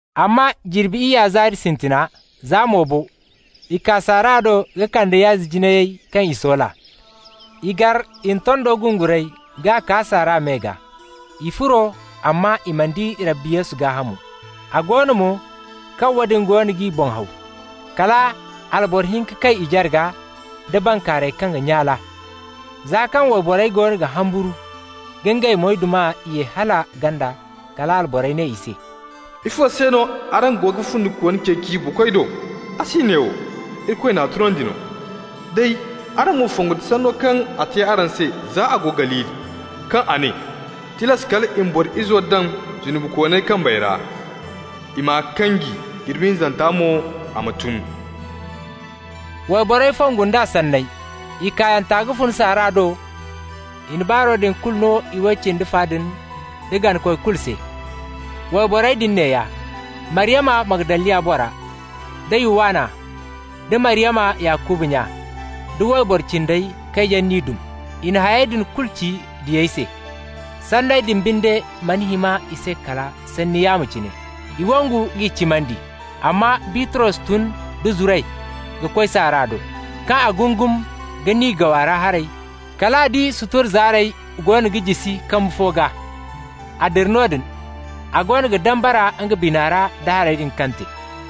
Amma jirbi iyya zaari sintina, za mo bo, i kaa saara do ka kande yaazi jinayey kaŋ i soola. I gar i na tondo gunguray k'a kaa saara me gaa. I furo, amma i mana di Rabbi Yesu gaahamo. A go no mo, kaŋ woodin goono g'i boŋ haw, kala alboro hinka kay i jarga nda bankaaray kaŋ ga nyaale. Za kaŋ wayborey goono ga humburu ka ngey moydumey ye hala ganda, kala alborey ne i se: «Ifo se no araŋ go ga fundikooni ceeci buukoy do? A si neewo. Irikoy n'a tunandi no. Day araŋ ma fongu nda sanno kaŋ a te araŋ se za a go Galili, kaŋ a ne: ‹Tilas kal i ma Boro Izo daŋ zunubikooney kambey ra, i m'a kanji, jirbi hinzanta mo a ma tun.›» Wayborey fongu nd'a sanney. I kaayanta ka fun saara do, i na baaro din kulu no iway cindi fa din da ganakoy kulu se. Wayborey din neeya: Maryama Magdaliya bora, da Yuwanna, da Maryama Yakuba nya, da wayboro cindey kaŋ yaŋ n'i dum. I na hayey din kulu ci diyey se. Sanney din binde mana hima i se kala sanni yaamo cine. I wangu k'i cimandi. Amma Bitros tun da zuray ka koy saara do. Kaŋ a gungum ka niigaw a ra haray, kal a di sutura zaarey goono ga jisi kambu fo gaa. A dira noodin, a goono ga dambara nga bina ra da hayey din kaŋ te.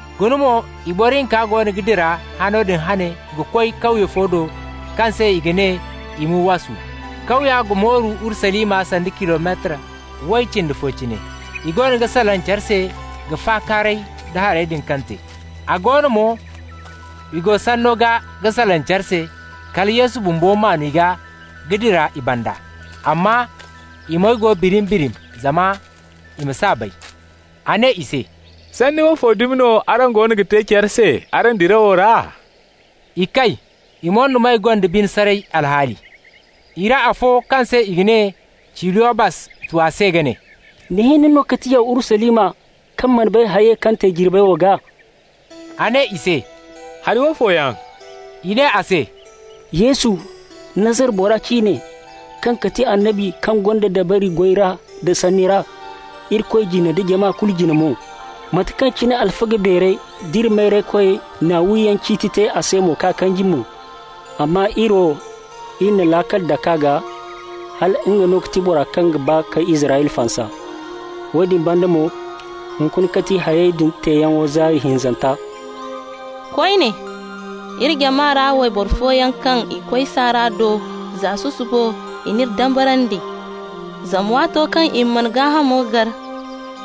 Guna mo, i boro hinka goono ga dira hano din hane ka koy kawye fo do kaŋ se i ga ne Imuwasu. Kawya ga mooru Urusalima sanda kilometar way cindi fo cine. I goono ga salaŋ care se ka fakaaray da hayey din kaŋ te. A go no mo, i go sanno gaa ga salaŋ care se, kala Yesu bumbo maan i gaa ka dira i banda. Amma i moy go birim-birim zama i ma s'a bay. A ne i se: «Sanni fo dumi no araŋ goono ga te care se araŋ dirawo ra?» I kay. I moydumey gonda bine saray alhaali. I ra afo kaŋ se i ga ne Ciliyobas tu a se ka ne: «Ni hinne no ga ti yaw Urusalima, kaŋ mana bay hayey kaŋ te jirbey wo gaa?» A ne i se: «Hari woofo yaŋ?» I ne a se: «Yesu, Nazara bora ciine, kaŋ ga ti annabi kaŋ gonda dabari goy ra da sanni ra, Irikoy jine da jama kulu jine mo. Mate kaŋ cine alfaga beerey d'iri mayraykoyey na wiyaŋ ciiti te a se k'a kanji mo. Amma iri wo, iri na laakal dak'a gaa, hala nga no ga ti boro kaŋ ga ba ka Israyla fansa. Woodin banda mo, hunkuna ga ti hayey din teeyaŋo zaari hinzanta. Koyne, iri jama ra wayboro fooyaŋ, kaŋ i koy saara do za susubo, i n'iri dambarandi. Zama waato kaŋ i man'a gaahamo gar,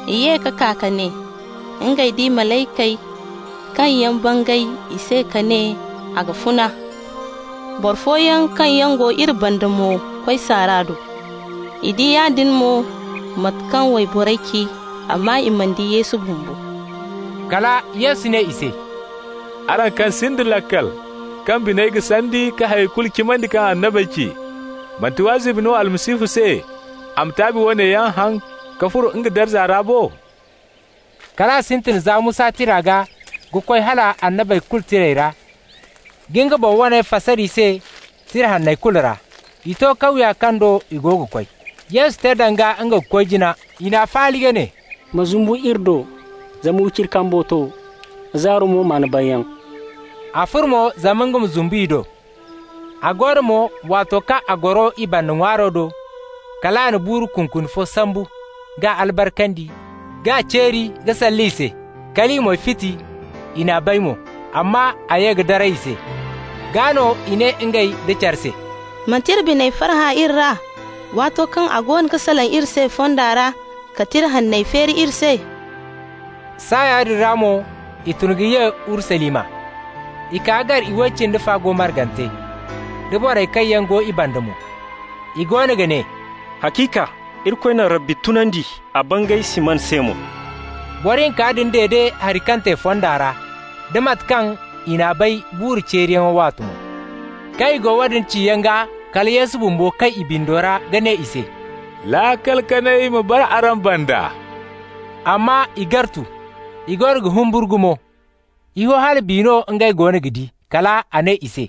i ye ka kaa ka ne ngey di malaykey kaŋ yaŋ bangay i se ka ne a ga funa. Boro fooyaŋ kaŋ yaŋ go iri banda mo koy saara do. I di yaadin mo no mate kaŋ wayborey ci, amma i mana di Yesu bumbo.» Kala Yesu ne i se: «Araŋ kaŋ sinda laakal, kaŋ biney ga sandi ka hay kulu cimandi kaŋ annabey ci. Manti wazibi no Almasihu se a ma taabi woone yaŋ haŋ, ka furo nga darza ra bo?» Kal a sintin za Musa tira gaa ka koy hala Annabey kulu Tirey ra, ka nga boŋ waney fasar i se Tira Hanney kulu ra. I to kawya kaŋ do i go ga koy. Yesu te danga nga ga koy jina. I n'a faali ka ne: «Ma zumbu iri do, zama wiciri kambo to, zaaro mo maan banyaŋ.» A furo mo zama nga ma zumbu i do. A go no mo, waato kaŋ a goro i banda ŋwaaro do, kal a na buuru kunkuni fo sambu k'a albarkandi, k'a ceeri ka salle i se. Kal i moy fiti, i n'a bay mo. Amma a ye ka daray i se. Gaa no i ne ngey nda care se: «Manti iri biney farhã iri ra, waato kaŋ a goono ga salaŋ iri se fonda ra, ka Tira Hanney feeri iri se?» Saaya din ra mo i tun ka ye Urusalima. I kaa ka gar iway cindi fa go margante, da borey kaŋ yaŋ go i banda mo. I goono ga ne: «Haciika, Irikoy na Rabbi tunandi, a bangay Siman se mo.» Boro hinka din dede hari kaŋ te fonda ra, da mate kaŋ i n'a bay buuru ceeriyaŋo waate mo. Kaŋ i go woodin ciyaŋ gaa, kala Yesu bumbo kay i bindo ra ka ne i se: «Laakal kanay ma bara araŋ banda.» Amma i gartu, i goono ga humburu gumo. I ho hala biya no ngey goono ga di. Kal a ne i se: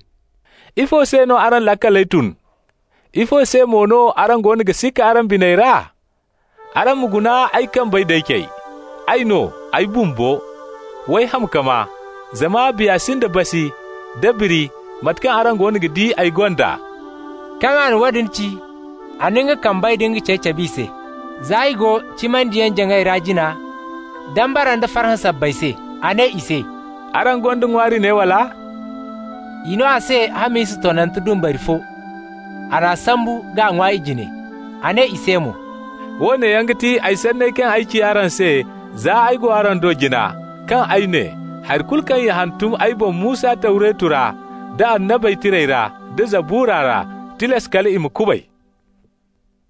«Ifo se no araŋ laakaley tun? Ifo se mo no araŋ goono ga sikka araŋ biney ra? Araŋ ma guna ay kambey d'ay cey. Ay no, ay bumbo. W'ay ham ka maa, zama biya sinda basi nda biri mate kaŋ araŋ goono ga di ay gonda.» Kaŋ a na woodin ci, a na nga kambey da nga cey cab'i se. Za i go cimandiyaŋ-jaŋay ra jina, dambara nda farhã sabbay se, a ne i se: «Araŋ gonda ŋwaari ne, wala?» I no a se hamisa tonnante dumbari fo. A n'a sambu k'a ŋwa i jine. A ne i se mo: «Woone yaŋ ga ti ay sanney kaŋ ay ci araŋ se, za ay go araŋ do jina, kaŋ ay ne: hari kulu kaŋ i hantum ay boŋ Musa Tawreto ra da Annabey Tirey ra da Zabura ra, tilas kal i ma kubay.»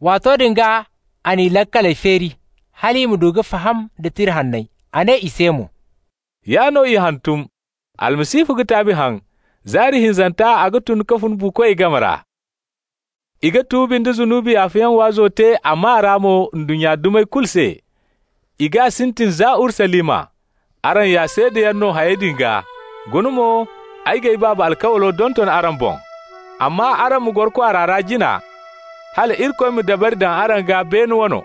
Waato din gaa a n'i laakaley feeri hal i ma du ka faham da Tira Hanney. A ne i se mo: «Yaa no i hantum: Almasihu ga taabi haŋ, zaari hinzanta a ga tun ka fun buukoy game ra. I ga tuubi nda zunubi yaafayaŋ waazo te a maa ra mo ndunnya dumey kulu se. I g'a sintin za Urusalima. Araŋ ya seedayaŋ no hayey din gaa. Guna mo, ay g'ay Baaba alkawlo donton araŋ boŋ. Amma araŋ ma goro kwaara ra jina hala Irikoy ma dabari daŋ araŋ gaa, beene wane.»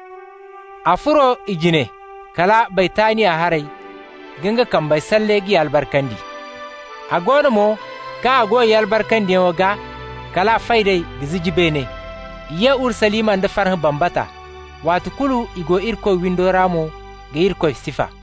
A furo i jine kala Baytaniya haray ka nga kambey salle k'i albarkandi. A go no mo, kaŋ a go i albarkandiyaŋo gaa, kal a fay d'ey ka ziji beene. I ye Urusalima nda farhã bambata. Waati kulu i go Irikoy windo ra mo ka Irikoy sifa.